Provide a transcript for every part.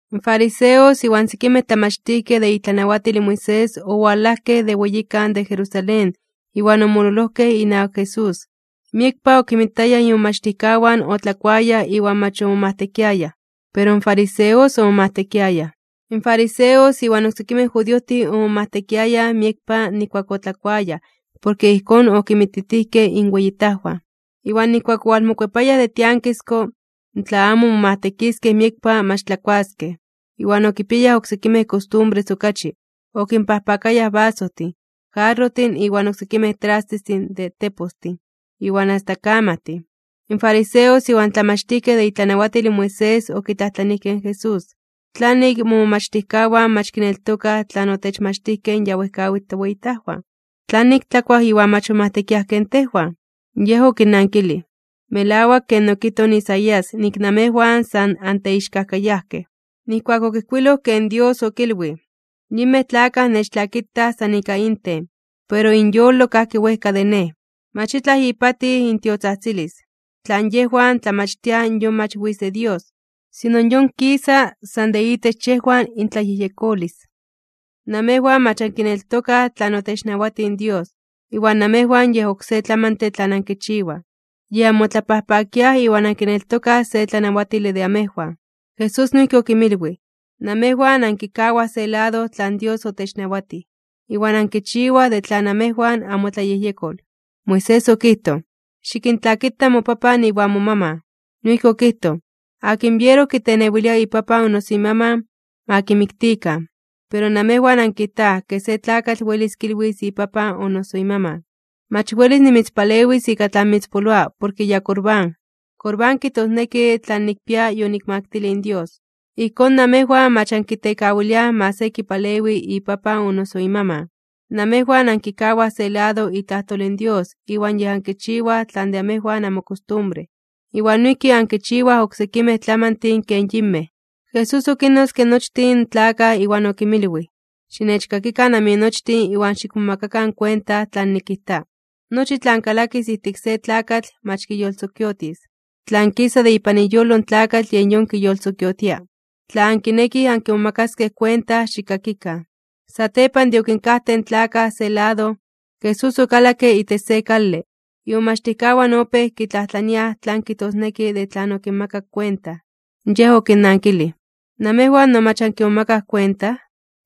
In fariseos iwan sekimej tlamachtijkej de itlanawatil in Moisés owalajkej de weyikan de Jerusalén iwan omololojkej inawak Jesús. Miekpa okinmitayaj imomachtijkawan otlakuayaj iwan mach omomajtekiayaj. Pero in fariseos omomajtekiayaj. (In fariseos iwan oksekimej judiojtin omomajtekiayaj miekpa nijkuak otlakuayaj porke ijkón okinmititijkej inweyitajwan. Iwan nijkuak owalmokuepayaj de tiankisko, tla amo momajtekiskej miekpa mach tlakuaskej, iwan okipiayaj oksekimej kostumbres okachi: okinpajpakayaj basojtin, jarrojtin iwan oksekimej trastestin de tepostin, iwan asta kamajtin.) In fariseos iwan tlamachtijkej de itlanawatil in Moisés okitlajtlanijkej in Jesús: ―¿Tlanik momomachtijkawan mach kineltokaj tlan otechmachtijkej in ya wejkawitl toweyitajwan? ¿Tlanik tlakuaj iwan mach momajtekiaj ken tejwan? Yej okinnankilij: ―Melawak ken okijtoj Isaías nik namejwan san anteixkajkayajkej. Nijkuak okijkuiloj ken Dios okilwij: Yinmej tlakaj nechtlakitaj san ika inten, pero inyolo kajki wejka de Nej. Mach itlaj ipatij intiotzajtzilis. Tlan yejwan tlamachtiaj yon mach witz de Dios, sino yon kisa san de itech yejwan intlayejyekolis. Namejwan mach ankineltokaj tlan otechnawatij in Dios, iwan namejwan yej oksé tlamantle tlan ankichiwaj, yej anmotlapajpakiaj iwan ankineltokaj se tlanawatile de amejwan. Jesús noijki okinmilwij: ―Namejwan ankikawaj se lado tlan Dios otechnawatij, iwan yej ankichiwaj de tlan namejwan anmotlayejyekol. Moisés okijtoj: “Xikintlakita mopapan iwan momaman.” Noijki okijtoj: “Akin biero kitenewilia ipapan o noso imaman, ma kimiktikan.” Pero namejwan ankijtaj ke se tlakatl welis kilwis ipapan o noso imaman: “Mach welis nimitzpalewis ika tlan mitzpoloa porke ya Corbán.” (Corbán kijtosneki tlan nikpia yonikmaktilij in Dios.) Ijkón, namejwan mach ankitekawiliaj ma se kipalewi ipapan o noso imaman. Namejwan ankikawaj se lado itlajtol in Dios iwan yej ankichiwaj tlan de amejwan anmokostumbre. Iwan noijki ankinchiwaj oksekimej tlamantin ken yinmej. Jesús okinnotzke nochtin tlakaj iwan okinmilwij: ―Xinechkakikan aminochtin iwan xikmomakakan kuenta tlan nikijta. Nochi tlan kalakis ijtik se tlakatl mach kiyolsokiotis. Tlan kisa de ipan iyolo in tlakatl yej yon kiyolsokiotia. Tla ankinekij ankimomakaskej kuenta, xikkakikan. Satepan de okinkajtej in tlakaj se lado, Jesús okalakke itech se kale, imomachtijkawan opéj kitlajtlaniaj tlan kijtosneki de tlan okinmakak kuenta. Yej okinnankilij: ―¿Namejwan no mach ankimomakaj kuenta?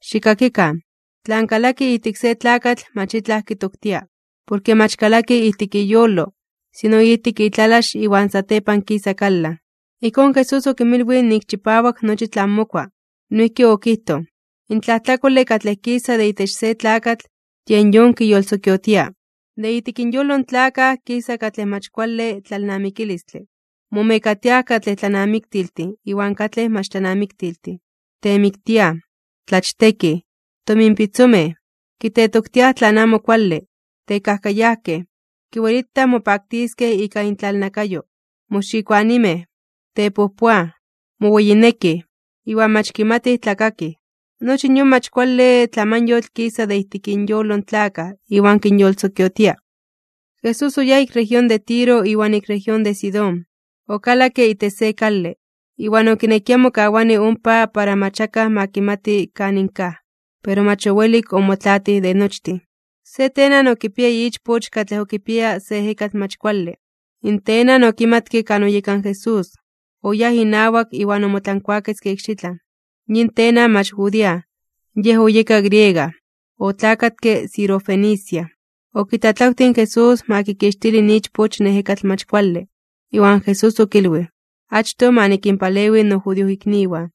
¡Xikkakikan! Tlan kalaki ijtik se tlakatl mach itlaj kitoktia. Porke mach kalaki ijtik iyolo, sino ijtik itlalax iwan satepan kisa kalan. Ijkón Jesús okinmilwij nik chipawak nochi tlan mokua. Noijki okijtoj: ―In tlajtlakole katlej kisa de itech se tlakatl, yen yon kiyolsokiotia. De ijtik inyolo in tlakaj kisa katlej mach kuale tlalnamikilistle, momekatiaj katlej tlanamiktiltin iwan katlej mach tlanamiktiltin, temiktiaj, tlachtekij, tominpitzomej, kitetoktiaj tlan amo kuale, tekajkayajkej, kiwelitaj mopaktiskej ika intlalnakayo, moxikoanimej, tepojpoaj, moweyinekij, iwan mach kimatij tlakakij. Nochi yon mach kuale tlamanyotl kisa de ijtik inyolo in tlakaj iwan kinyolsokiotia. Jesús oyáj ik región de Tiro iwan ik región de Sidón. Okalakke itech se kale, iwan okinekia mokawani ompa para mach akaj ma kimati kanin kaj, pero mach owelik omotlaatij de nochtin. Se tenan okipiaya ichpoch katlej okipiaya se ejekatl mach kuale. In tenan okimatke kan oyeka in Jesús, oyáj inawak iwan omotlankuaketzke ikxitlan. Yin tenan mach judía, yej oyeka griega, otlakatke Sirofenicia. Okitlatlawtij in Jesús ma kikixtili in ichpoch in ejekatl mach kuale. Iwan Jesús okilwij: ―Achtoj ma nikinpalewi nojudiojikniwan.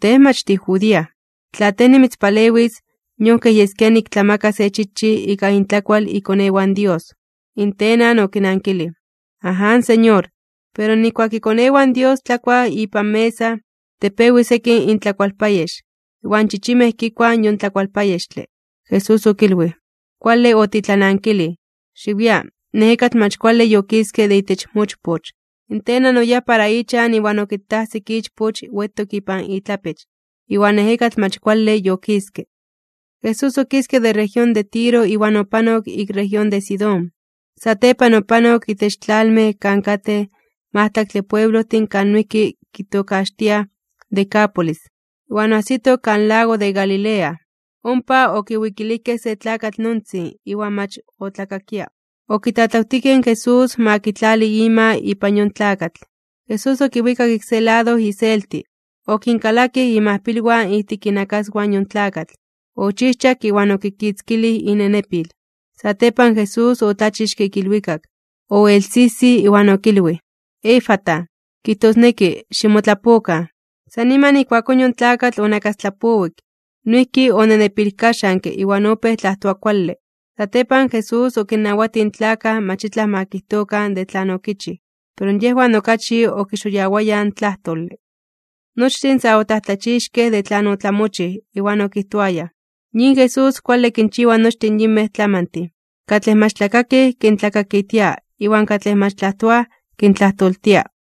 Tej mach tijudía. Tla tej nimitzpalewis, yon kej yeskia niktlamaka se chichij ika intlakual ikonewan Dios. In tenan okinankilij: ―Aján, Señor. Pero nijkuak ikonewan Dios tlakuaj ipan mesa, tepewi sekin intlakualpayex, iwan chichimej kikuaj yon tlakualpayextle. Jesús okilwij: ―Kuale otitlanankilij, xiwia, in ejekatl mach kuale yokiske de itech mochpoch. In tenan oyáj para ichan iwan okitajsik ichpoch wetok ipan itlapech, iwan ejekatl mach kuale yokiske. Jesús okiske de región de Tiro iwan opanok ik región de Sidón. Satepan opanok itech tlalmej kan katej majtlaktle pueblojtin kan noijki kitokaxtiaj Decápolis, iwan oajsito kan lago de Galilea. Ompa okiwikilijkej se tlakatl nontzin iwan mach otlakakia. Okitlatlawtijkej in Jesús ma kitlali ima ipan yon tlakatl. Jesús okiwikak ik se lado iselti, okinkalakij imajpilwan ijtik inakaswan in yon tlakatl, ochijchak iwan okikitzkilij inenepil. Satepan Jesús otlachixke ik ilwikak, oelsijsij iwan okilwij: ―¡Efata! ―kijtosneki: ¡Ximotlapokan! San niman ijkuakón yon tlakatl onakastlapowik, noijki onenepilkaxanke iwan opéj tlajtoa kuale. Satepan, Jesús okinnawatij in tlakaj mach itlaj ma kijtokan de tlan okichij, pero yejwan okachi okixoyawayaj in tlajtole. Nochtin sa otlajtlachixkej (omomajmawtijkej) de tlan otlamochij, iwan okijtoayaj: ―Yin Jesús kuale kinchiwa nochtin yinmej tlamantin. Katlej mach tlakakij kintlakakitia iwan katlej mach tlajtoaj kintlajtoltia.